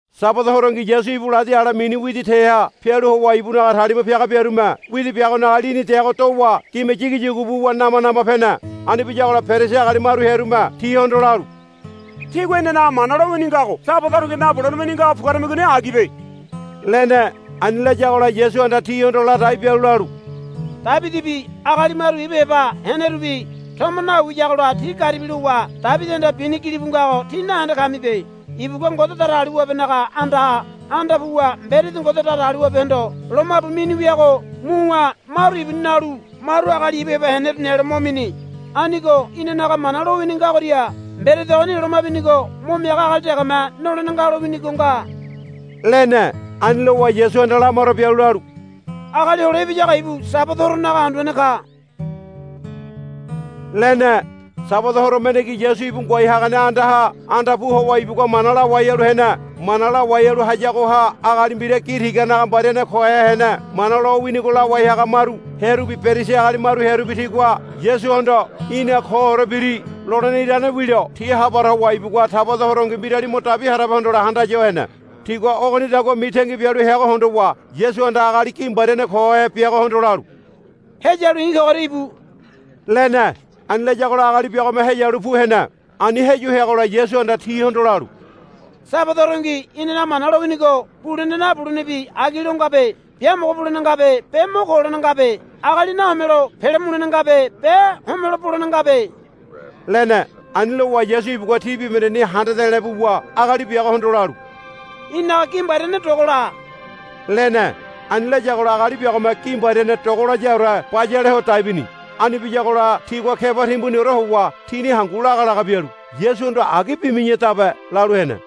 Sabada horongi Yasu ibu ladi ale mini widi teha pialu howa ibunaga talima piaga biarume widi biagonaga lini deago dowa gime yigiyugu buwa nama nama pene. Ani biyagola Perisi agali maru hearume tihondo lalu, Tígua inanaga Mana lowini ngago Sabada horongi nabulene wini ngago puguaramigoni agibe, lene. Ani layagola Yasuhanda tihondo ladai bialu lalu, Debidibi agali maru ibu heba henerubi tomo nawiyagola ti garibi lowa Debidihanda bini gilibu ngago tí nahende kamibe. Ibugua Ngode Datagaliwabenaga andaha anda puwa mberedi Ngode Datagaliwabehondo lomabu mini wiago muwa maru ibuni nalu maru agali ibu heba heneru nelo mo mini. Anigo inanaga Mana lowini ngagoria mberedi ogoni loma binigo mo miaga agali degeme nolene nga lowinigo nga, lene. Ani lowa Yasuhanda lamaro bialu lalu, Agali Hole Ibiyago ibu Sabada horonaga Anduane ka, lene. Sabada horo mendengi Yasu ibu ngoai hagane andaha anda pu howa ibugua mana lawai halu hene. Mana lawai halu hayagoha agali mbira gi tiganaga mbariane kohe hene. Mana lowinigo lawai haga maru hearubi Perisi agali maru hearubi tigua Yasuhondo, Í̠na koore biri, lolene irane wilo ti ha para howa ibugua Sabada horongi mbirali mo dabi harabe hondole handaya ho hene. Tigua ogonidagua mitangi bialu heago hondowa Yasuhanda agali gi mbariane kohe biagohondo lalu, Heyalu i̱ kogoria íbu, lene. Ani layagola agali biagome heyalu pu hene. Ani heyu heagola Yasuhanda tihondo lalu, Sabada horongi inanaga Mana lowinigo bulene nabulenebi agi lo ngabe. Biamogo bulene ngabe be mo ko holene ngabe. Agali nahomelo pele mulene ngabe be homelo bolene ngabe, lene. Ani lowa Yasu ibugua ti bibahendeni handa de̱le̱ buwa agali biagohondo lalu, Í̠naga gi mbariane dogola, lene. Ani layagola agali biagome gi mbariane dogolayaore bayale ho dai bini. Ani biyagola tigua keba timbuniore howa tini hangu laga laga bialu, Yasuhondo agi bimi̱yadabe, lalu hene.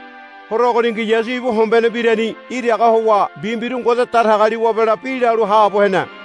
Horo ogoningi Yasu ibu hombene mbirani iraga howa mbi mbiru Ngode Datagaliwabela bi lalu haabo hene.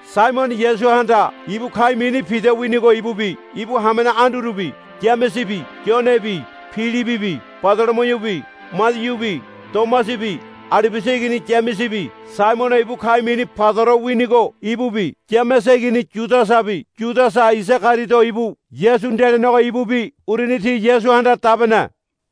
Saimono Yasuhanda ibu ka̱i̱ mini Pida winigo ibubi ibu hamene Andurubi Yamesebi Yonebi Pilibibi Badolomiubi Madiubi Tomasabi Alibiasa igini Yamesebi Saimono ibu ka̱i̱ mini Paidoro winigo ibubi Yamese igini Yudasabi Yudasa Isagariodo ibu Yasu nde lenego ibubi uruni ti Yasuhanda dabene.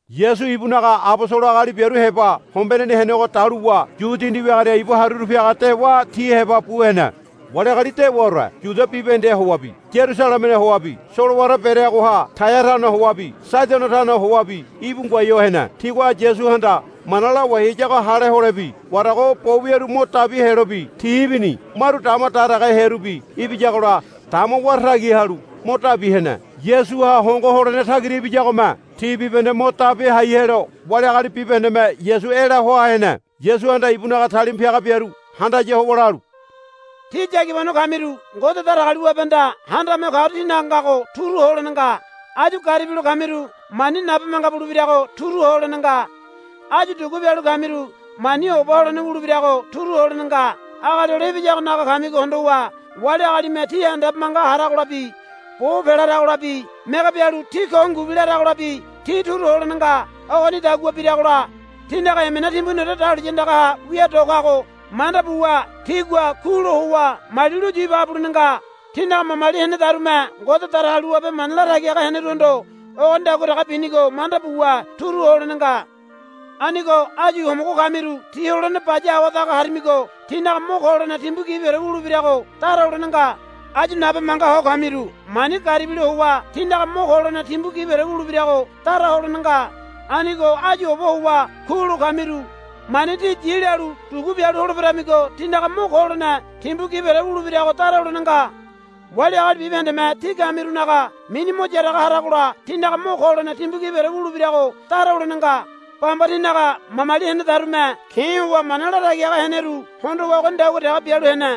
Yasu ibunaga abosolo agali biaru heba hombeneni henego daluwa yu dindi wiagoria ibu haruru piaga dewa ti heba bu hene. Wali agali dewaore Yudia bibahendeha howabi Yarusalemeha howabi solowara bereagoha Taia tano howabi Saidono tano howabi íbu ngoai ho hene. Tigua Yasuhanda mana lawai hayago hale holebi warago bo wiaru mo dabi helobi ti ibini. Maru dama daragahe hearubi ibiyagola dama wara tagi halu mo dabi hene. Yasuha howa hongo holene tagira ibiyagome ti bibahende mo dabi hai helo wali agali bibahendeme Yasu ela hoa hene. Yasuhanda ibunaga talima piaga biaru handaya howa lalu, Tí yagibano kamiru Ngode Datagaliwabehanda Handame Ho Kagoria tínaga ngago turu ho holene nga. Áyu garibilo kamiru mani nabe manga bulebirago turu ho holene nga. Áyu dugu bialu kamiru mani oba holene wulebirago turu ho holene nga. Agali Hole Ibiyagonaga kamigo hondowa wali agalime tí handabe manga haragolabi bo pelaragolabi mege bialu tí ko ngubi laragolabi tí turu ho holene nga. Ogonidagua biragola tínaga emena timbuniore dahuliya andagaha wia do kago manda buwa tígua kulo howa mali luyu ibaga bulene nga. Tinaga mamali henedarume Ngode Datagaliwabe mana latagi haga heneruhondo ogonidagua dege binigo manda buwa turu ho holene nga. Anigo áyu homogo kamiru tí holene baya awadaga harimigo tínaga mo ko holene timbu gibiore wulebirago dara holene nga. Áyu nabe manga ho kamiru mani garibilo howa tínaga mo ko holene timbu gibiore wulebirago dara holene nga. Anigo áyu oba howa kulo kamiru mani tí yi lalu dugu bialu holeberamigo tínaga mo ko holene timbu gibiore wulebirago dara holene nga. Wali agali bibahendeme tí kamirunaga mini mo yaraga haragola tínaga mo ko holene timbu gibiore wulebirago dara holene nga. Bamba tinaga mamali henedarume ke̱ howa mana latagi haga heneru hondowa ogonidagua dege bialu hene.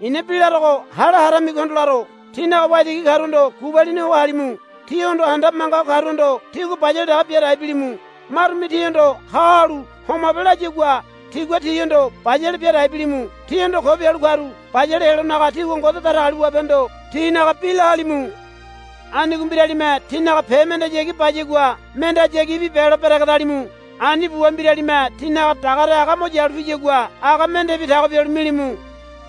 I̱na bi larogo hale haramigohondo laro. Tínaga waitigi karuhondo gubalini ho halimu. Tíhondo handabe manga ho karuhondo tígua bayale dege bia dai bilimu. Marume tíhondo ha halu homabe layagua tígua tihondo bayale bia dai bilimu. Tíhondo ko bialu karu bayale helonaga tígua Ngode Datagaliwabehondo tinaga bi la halimu. Anigo mbiralime tínaga pe mendeyagi bayagua mendehayagibi belo beregedalimu. Ani buwa mbiralime tínaga dagare aga mo yalu piyagua aga mendebi tago bialu milimu.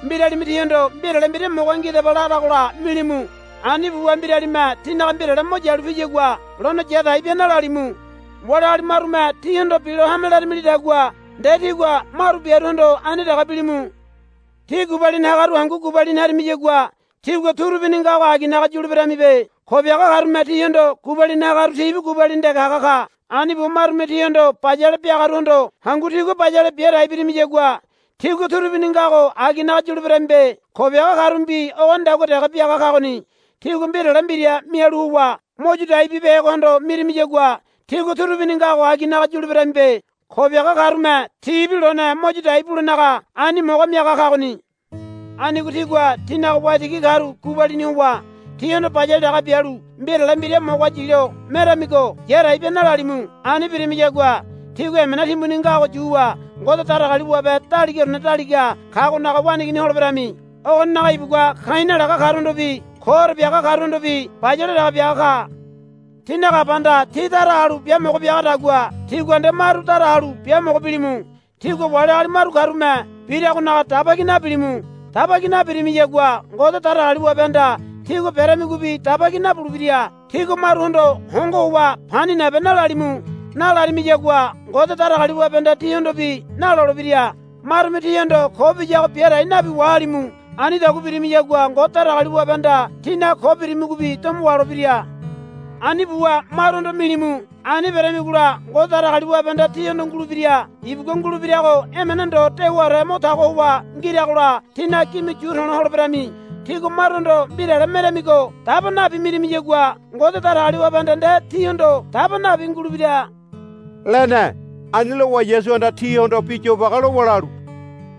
Mbiralime tíhondo mbirale mbira moga ngidaba laragola milimu. Ani buwa mbiralime tínaga mbirale mo yalu piyagua lone yadai bia nalalimu. Wali agali marume tíhondo bilo hame laramilidagua nde tígua maru biaruhondo ani dege bilimu. Tí gubalini hagaru hangu gubalini harimiyagua tígua turubini ngago aginaga yuleberamibe. Ko biaga karume tihondo gubalini hagaru tibi gubalini dege haga ka. Ani buwa marume tíhondo bayale biagaruhondo hangu tígua bayale bia dai birimiyagua tígua turubini ngago aginaga yuleberamibe. Ko biaga karumebi ogonidagua dege biaga kagoni. Tígua mbirale mbira mialu howa mo yu dai bibehegohondo mirimiyagua tígua turubini ngago aginaga yuleberamibe. Ko biaga karume tibi lone mo yu dai bulenaga ani moga miaga kagoni. Anigo tígua tínaga waitigi karu gubalini howa tihondo bayale dege bialu mbirale mbira moga yilo meramigo yadai bia nalalimu. Ani birimiyagua tígua emena timbuni ngago yuwa Ngode Datagaliwabe Daligaorene Daliga Kagonaga waneigini holeberami. Ogoninaga ibugua ka̱i̱ nalaga karuhondobi koore biaga karuhondobi bayale dege biaga ka. Tínaga Abahanda tí dara halu biamogo biagadagua tígua nde maru dara halu biamogo bilimu. Tígua wali agali maru karume biragonaga daba ki nabilimu. Daba ki nabirimiyagua Ngode Datagaliwabehanda tígua beramigobi daba ki nabulebira. Tígua maruhondo hongo howa, Pani nabe, nalalimu. Nalarimiyagua Ngode Datagaliwabehanda tíhondobi nalolebira. Marume tíhondo ko biyago biadai nabi wahalimu. Anidagua birimiyagua Ngode Datagaliwabehanda tínaga ko birimigobi domo waholebira. Ani buwa maruhondo milimu. Ani beramigola Ngode Datagaliwabehanda tíhondo ngulebira. Ibugua ngulebirago emene ndo dewaore mo tago howa ngiragola tínaga gime yu to̱lo holeberami. Tígua maruhondo mbirale meramigo daba nabi mirimiyagua Ngode Datagaliwabehanda nde tíhondo daba nabi ngulebira, lene. Ani lowa Yasuhanda tihondo bi yobage lowa lalu,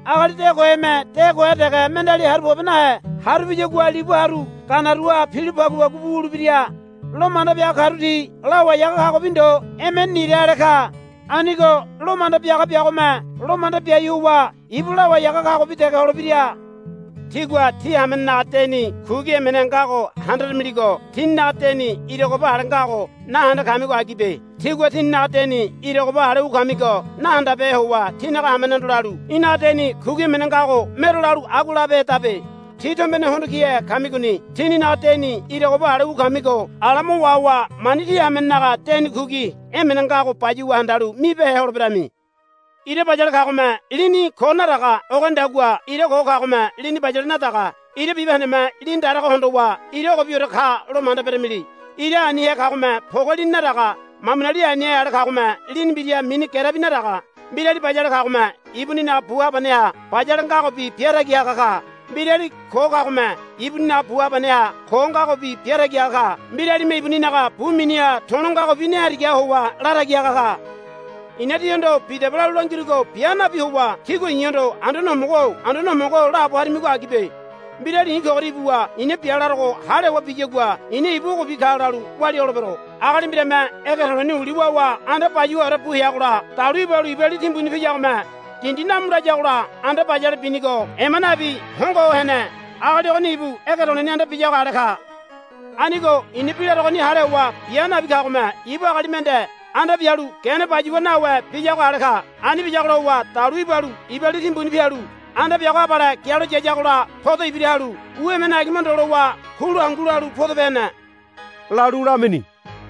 Agali de koheme de kohe dege mendeali haru pobe nahe. Haru piyagua libu haru ganaruaha pilo pagupagu bu wulebira. Lo manda biaga karu ti lawai haga kagobi ndo emene nira ale ka. Anigo lo manda biaga biagome lo manda biai howa ibu lawai haga kagobi dege holebira. Tígua tí hamenenaga deni kugi emene ngago handaramiligo tíninaga deni ira goba ale ngago nahende kamigo agibe. Tígua tíninaga deni ira goba ale wu kamigo nahandabehe howa tí hamenehondo lalu, Í̠naga deni kugi emene ngago mero, lalu agua labehedabe. Tí tombene hondo kihe kamigoni. Tíninaga deni ira goba ale wu kamigo ala mo wahowa mani tí hamenenaga deni kugi emene ngago bayuwa handalu mibehe holeberami. Ira bayale kagome lini ko nadaga. Ogonidagua ira ko kagome lini bayale nadaga. Ira bibahendeme lini darago hondowa ira ogobiore kalo manda beramili. Ira anihe kagome poge lini nadaga. Mamuni anihe ale kagome lini mbira mini gerebi nadaga. Mbirali bayale kagome ibuninaga bu habaneha bayale ngagobi biatagi haga ka. Mbirali ko kagome ibuninaga bu habaneha ko ngagobi biatagi haga ka. Mbiralime ibuninaga bu miniha to̱lo ngagobi ne harigaha howa latagi haga ka. I̱na tíhondo bidaba lalu langirugo bia nabi howa tígua i̱hondo, Anduane Homogo-o Anduane Homogo-o, laabo harimigo agibe. Mbirali i̱ kogoria ibuwa i̱na bi larogo hale howa biyagua i̱na ibu ogobi ka lalu walia holebero. Agali mbirame ege to̱le̱ni uli wawa anda bayuwaore bu heagola dalu ibalu iba li timbuni piyagome dindi namu layagola anda bayale binigo ema nabi hongo ho hene. Agali ogoni ibu ege to̱le̱ni anda biyago ale ka. Anigo i̱na bi larogoni hale howa bia nabi kagome ibu agali mende anda bialu gene bayuwa nawe biyago ale ka. Ani biyagola howa dalu ibalu iba li timbuni pialu anda biago abale gialo yayagola poda ibira halu u emene agima ndo lowa kulu hangu lalu podope hene, lalu lamini.